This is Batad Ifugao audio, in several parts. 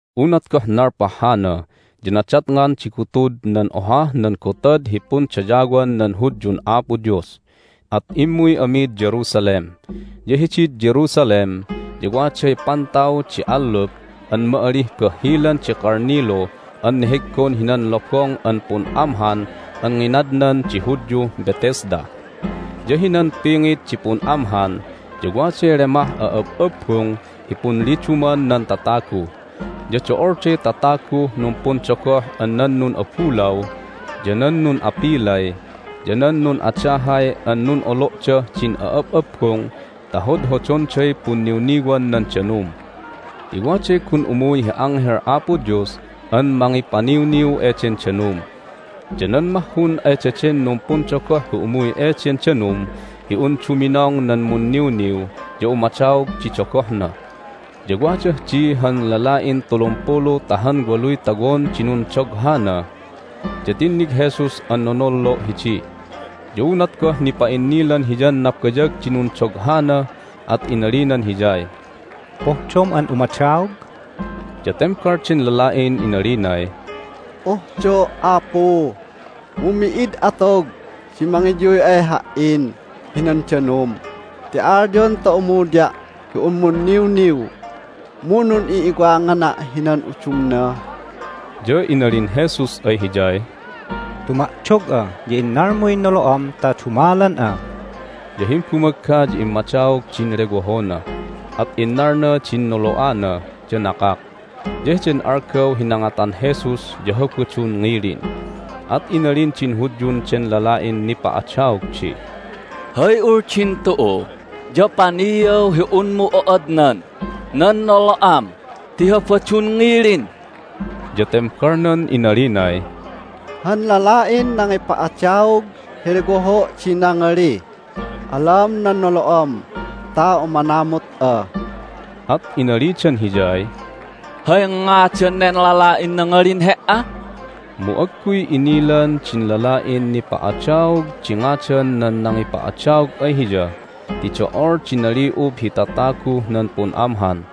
Unat goh nalpah hana ya nadatngan di gutud nan ohah nan gotad hi pundayawan nan Hudyun Apo Dios, at immuy amid Jerusalem. Ya hidid Jerusalem ya waday pantaw di allup an ma'alih Bahhilan di Kalnilu an neheggon hinan lobong an pun'amhan an nginadnan di Hudyuh Bethesda. Ya hinan pingit di pun'amhan ya waday lemah a'ab'abbung hi punliduman nan tatagu. Ya do'olday tataguh numpundogoh an nan nun'abulaw, ya nan nun'apilay, ya nan nun'adahay an nun'olo'dah din a'ab'abbung ta hodhodonday punniwniwan nan danum ti waday gun umuy hi anghel Apo Dios an mangipaniwniw eden danum. Ya nan mahhun ay daden numpundogoh hi umuy eden danum hi un duminong nan munniwniw ya umadaog di dogohna. Ya wadah di han lala'in tulumpulu ta han waluy tawon di nundoghana. Ya tinnig Jesus an nonollo' hidi. Ya unat goh nipa'innilan Hiyan nabayag di nundoghana at inalinan hiyay, "Pohdom an umadaog?" Ya tembal den lala'in inalinay, "Pohdo', Apu, mu mi'id atog di mangiyuy ay ha"in hinan danum ti alyon ta umuya' hi un numiwniw, mu nun'i'iwangana' hinan udumna." Ya inalin Jesus ay hiyay, "Tuma'dog'a, ya innalmuy nolo'am ta dumalan'a." Ya himbumagga ya immadaog din lewohona, at innalna din nolo'ana, ya nakak. Ya heden algaw hi nangatan Jesus ya Habadun ngilin, at inalin din Hudyun den lala'in nipa'adaog di, "Hay uldin tu'u ya paniaw hi unmu o'odnan nan nolo'am ti Habadun ngilin!" Ya tembalnan inalinay, "Han lala'in nangipa'adaog hi lewoho' di nangalih, Alam nan nolo'am ta umanamut'a." At inalidan hiyay, "Hay ngadan nen lala'in nangalin he"a?" Mu agguy inilan din lala'in nipa'adaog di ngadan nan nangipa'adaog ay hiya ti do'ol di nali'ub hi tataguh nan pun'amhan,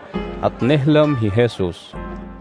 at nehlam hi Jesus.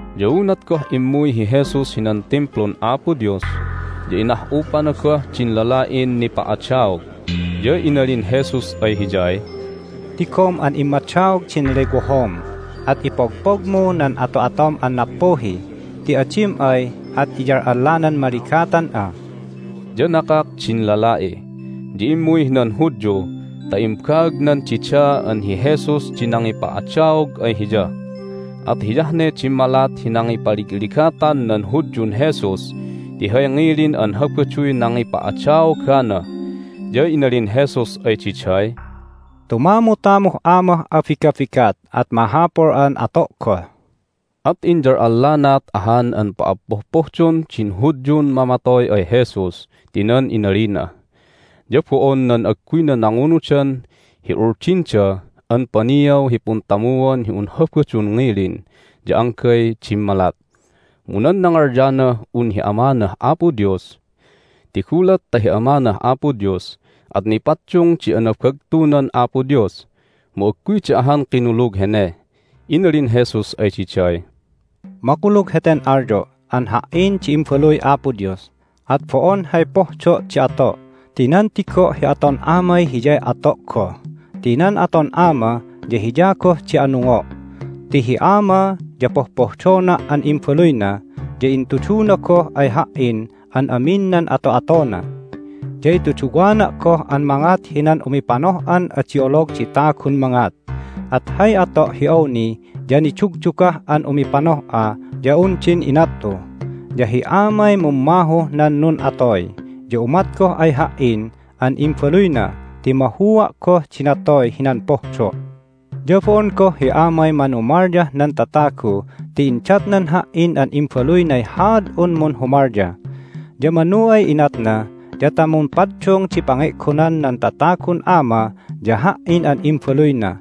Ya unat goh immuy hi Jesus hinan Timplun Apo Dios ya inah'upana goh din lala'in nipa'adaog, ya inalin Jesus ay hiyay, "Tigom an immadaog din lewohom, at ipogpogmu nan ato'atom an nappuhi, ti adim ay at iyal'allanan maligatan'a." Ya nakak din lala'i, ya immuy hinan Hudyu ta imbaagnan dida an hi Jesus di nangipa'adaog ay hiya. At hiyah ne dimmalat hi nangipaligligatan nan Hudyun Jesus ti hay ngilin an Habaduy nangipa'adaogana. Ya inalin Jesus ay diday, "Tumamutamuh Amah abigabigat, at mahapul an ato' goh." At inyal'allanaat ahan an pa'appopohdon din Hudyun mamatoy ay Jesus ti nan inalina. Ya bo'on nan agguyna nangunudan hi uldinda an paniaw hi puntamuan hi un Habadun ngilin ya anggay dimmalat, mu nan nangalyanah un hi Amanah Apo Dios. Ti gulat ta hi Amanah Apo Dios at nipaddung di anabagtunan Apo Dios, mu agguyda ahan kinulug hene. Inalin Jesus ay diday, "Makulug heten alyo' an Ha"in di Imbaluy Apo Dios, at bo'on hay pohdo' di ato' ti nan tigo' hi aton Amay hiyay ato' goh. Ti nan aton Ama ya hiya goh di anungo' ti hi Ama ya pohpohdona' an Imbaluyna, ya intuduna goh ay Ha"in an amin nan ato'atona. Ya ituduwana' goh an mangat hinan umipanoh'an adi olog di tagun mangat, at hay ato' hi awni ya nidugdugah an umipanoh'a ya un din inat'u. Ya hi Amay mummahuh nan nun'atoy, ya umat goh ay Ha"in an Imbaluyna ti mahua' goh di natoy hinan pohdo'. Ya bo'on goh hi Amay manumalyah nan tatagu ti indatnan Ha"in an Imbaluynay haad'un munhumalya. Ya manu ay inatna ya ta mumpaddung di pange'gonan nan tatagun Ama ya Ha"in an Imbaluyna.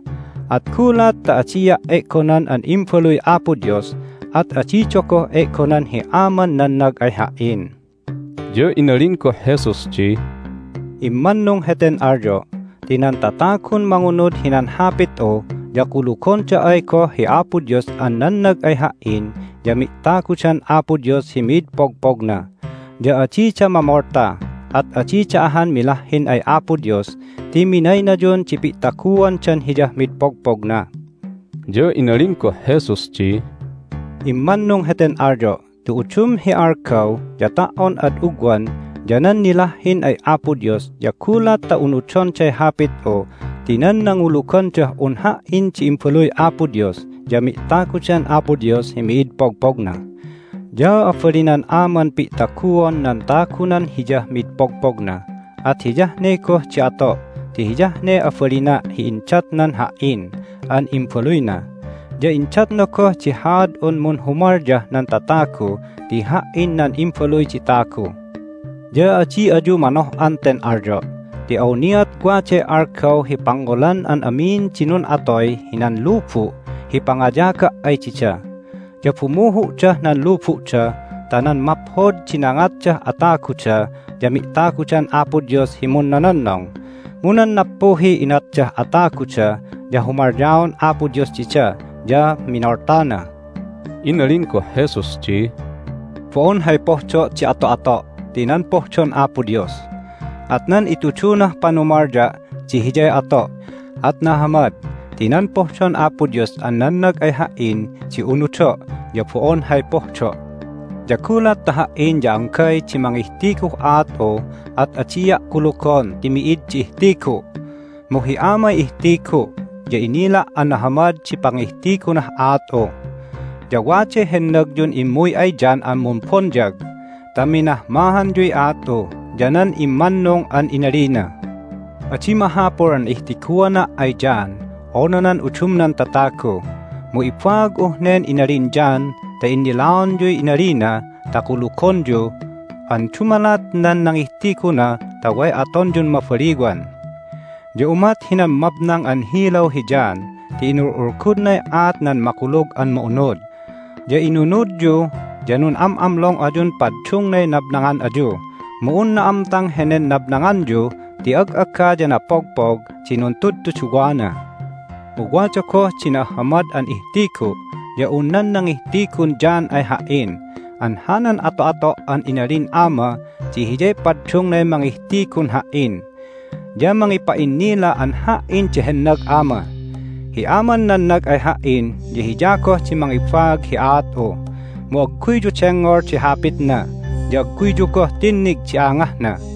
At gulat ta adia' e'gonan an Imbaluy Apo Dios at adida goh e'gonan hi Aman nannag ay Ha"in." Ya inalin goh Jesus di, "Immannung heten alyo' ti nan tatagun mangunud hinan Hapit'u ya kulugonda ay goh hi Apo Dios an nannag ay Ha"in ya mi'tagudan Apo Dios hi mid pogpogna. Ya adida mamolta, at adida ahan milahhin ay Apo Dios ti minaynayun di pi'taguandan Hiyah mid pogpogna." Ya inalin goh Jesus di, "Immannung heten alyo' ti udum hi algaw ya ta"on ad ugwan ya nan nilahhin ay Apo Dios ya gulat ta unudonday Hapit'u ti nan nangulugandah un Ha"in di Imbaluy Apo Dios ya mi'tagudan Apo Dios hi mid pogpogna. Ya abalinan Aman pi'taguon nan tagunan Hiyah mid pogpogna, at hiyah ne goh di ato' ti hiyah ne abalina' hi indatnan Ha"in an Imbaluyna. Ya indatna goh di haad'un munhumalyah nan tatagu ti Ha"in nan Imbaluy di Tagu. Ya adi ayu manoh'an ten alyo' ti awniat waday algaw hi pangngolan an amin di nun'atoy hinan lubu' hi pangayaga' ay dida, ya bumuhu'dah nan lubu'da ta nan maphod di nangatdah ataguda ya mi'tagudan Apo Dios hi munnononnong, mu nan nappuhiy inatdah ataguda ya humalyaon Apo Dios dida, ya minoltana." Inalin goh Jesus di, "Bo'on hay pohdo' di ato'ato' ti nan pohdon Apo Dios. At nan itudunah panumalya' di hiyay ato', at nahamad ti nan pohdon Apo Dios an nannag ay Ha"in di unudo', ya bo'on hay pohdo'. Ya gulat ta Ha"in ya anggay di mangihtiguh aat'u at adia' kulugon ti mi'id di ihtigu'. Mu hi Amay ihtigu', ya inila' an nahamad di pangihtigunah aat'u. Ya waday hennagyun immuy ay John an Mumbonyag ta minahmahanyuy aat'u ya nan immannung an inalina. Adi mahapul an ihtiguana' ay John unu nan udumnan tatagu, mu ibaag'uh nen inalin John ta innilaonyuy inalina ta kulugonyu an dumalat nan nangihtiguna ta way atonyun mabaliwan. Ya umat hinan mabnang an hilaw hi John ti inul'ulgudnay aat nan Makulug an Ma'unud, ya inunudyu, ya nun'am'amlong ayun paddungnay nabnangan ayu. Mu un na'amtang henen nabnanganyu ti ag'aga ya napogpog di nuntudtuduwana. Mu wada goh di na'ahhamad an ihtigu' ya un nan nangihtigun John ay Ha"in an hanan ato'ato' an inalin Ama di hiyay paddungnay mangihtigun Ha"in ya mangipa'innila an Ha"in di hennag Ama. Hi Aman nannag ay Ha"in ya Hiya goh di mangibaag hi aat'u. Mu agguyyu dengngol di hapitna, ya agguyyu goh tinnig di angahna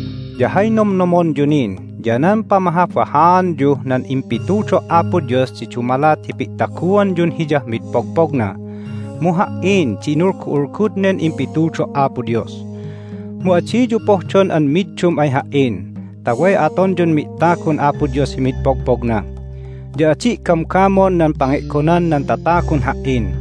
Ya hay nomnomonyu nin ya nan pamahabahaanyuh nan impitudo' Apo Dios di dumalat hi pi'taguanyun Hiyah mid pogpogna. Mu Ha"in di inulgu'ulgud nen impitudo' Apo Dios. Mu adiyu pohdon an middum ay Ha"in ta way atonyun mi'tagun Apo Dios hi mid pogpogna. Ya adi' gamgamon nan pange'gonan nan tatagun Ha"in.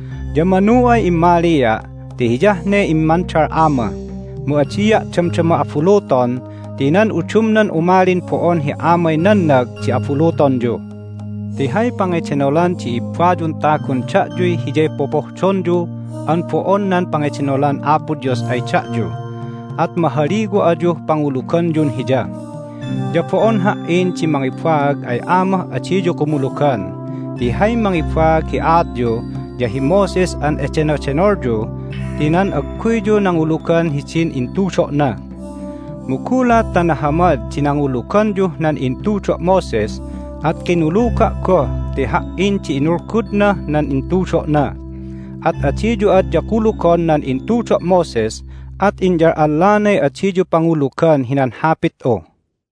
Ya manu ay immalia' ti hiyah ne immandal Ama. Mu adia' damdama abuluton ti nan udumnan umalin bo'on hi Amay nannag di abulutonyu. Ti hay pangedenolan di ibbayun tagun da'yuy hiyay popohdonyu an bo'on nan pangedenolan Apo Dios ay da'yu, at mahaliwa ayuh panguluganyun Hiya. Ya bo'on Ha"in di mangibaag ay Amah adiyu kumulugan, ti hay mangibaag hi aatyu ya hi Moses an edenodenolyu ti nan agguyyu nangulugan hidin intudo'na. Mu gulat ta nahamad di nanguluganyuh nan intudo' Moses at kinuluga' goh ti Ha"in di inulgudnah nan intudo'na. At adiyu adya kulugon nan intudo' Moses at inyal'allanay adiyu pangulugan hinan Hapit'u."